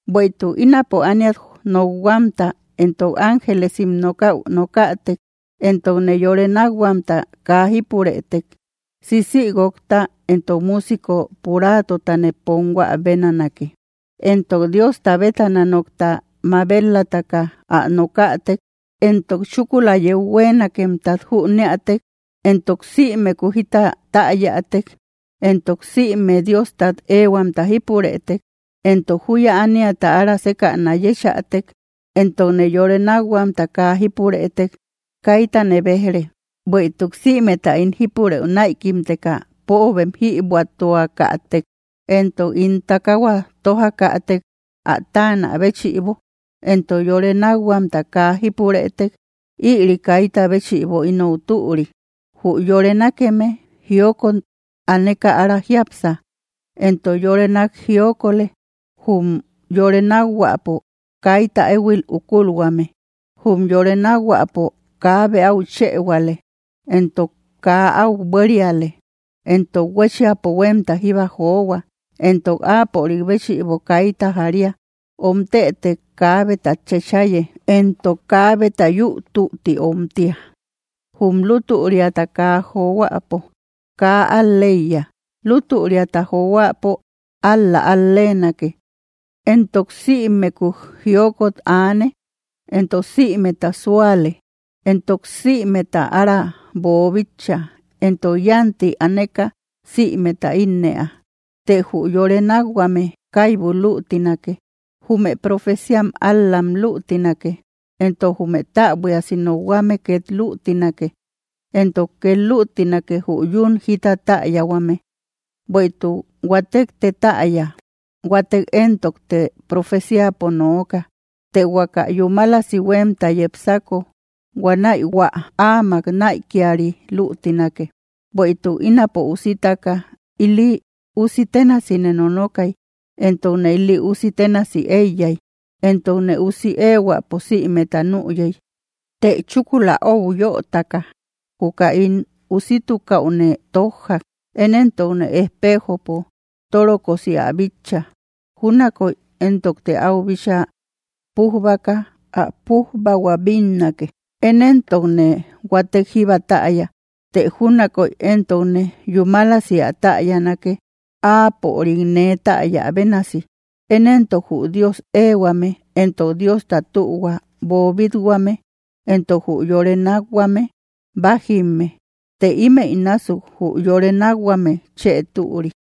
Bueïtuk ínapo ániat nokhuamta entok ángelesim nokaü nokätek, entokne yore nakhuamta kaa jípurëtek, sisigúokta entok musico puratotane ponhuä benanake. Entok Diosta betána nokta mabel‑lataka ä nokätek, entok chúkula yeu huenakemtat jüneatek, entok sïmeku jita täyatek, entok sïme Diostat ehuamta jípurëtek, entok juya ániata ára sekäna yechätek, entokne yore nakhuamta kaa jípurëtek, kaytane bejre. Bueïtuk sïmeta ín jípurëu naïkimteka póobem jïbuatuakatëk; entok ín takahua tojakätek ä taanä béchïbo, entok yore nakhuamta kaa jípurëtek, ïri kayta béchïbo inou türi. Jü yore nákeme jiokot aneka ára jiápsa, entok yore nak jiokolë; jum yore nakhuäpo kayta ehuil ukulhuame, jum yore nakhuäpo kabe au chëhuale, entok kaa au buériale. Entok huéchiapo huemta jíba johua, entok áapörik béchïbo kayta jaria, omtetëk kabetat chachaye, entok kabeta yü tütti omtia. Jum lutüriata kaa johuäpo kaa al‑leiya, lutüriata johuäpo, ál‑la al‑lenake. Entok sïmeku jiokot aane, entok sïmeta suaale, entok sïmeta ára boobítcha, entok yanti aaneka sïmeta innëa. Të jü yore nákhuame kaybu lütinake; jume profeciam ál-lam lütinake, entok jume täbuiasi nokhuame ket lütinake, entok ket lütinake jü yún jita täyahuame. Bueïtuk huatekte täya, huatek entokte profeciapo nooka. Të huaka yúmalasi huemta yepsako, huanäi hua ámak naïkiari lütinake. Bueïtuk ínapo usitaka, ili usi ténasine nonokay, entokne ili usi tenasi eíyay, entokne usi ehuäpo sïmeta nüyey; të chúkula öu yötaka, juka ín usitukaüne tojjak. Én entokte ejpejopo torokosi ä bitcha, júnakoy entokte au bíchaa pujbaka ä pujbahua bínnake, én entokne huatek jíba täya, të júnakoy entokne yúmalasi ä täyanake áapörikne täya bénasi. Én entok jü Dios ehuame, entok Diosta tühua boobit-huame entok jü yore nakhuame, bájimme, të imeï násuk jü yore nakhuame chë türi.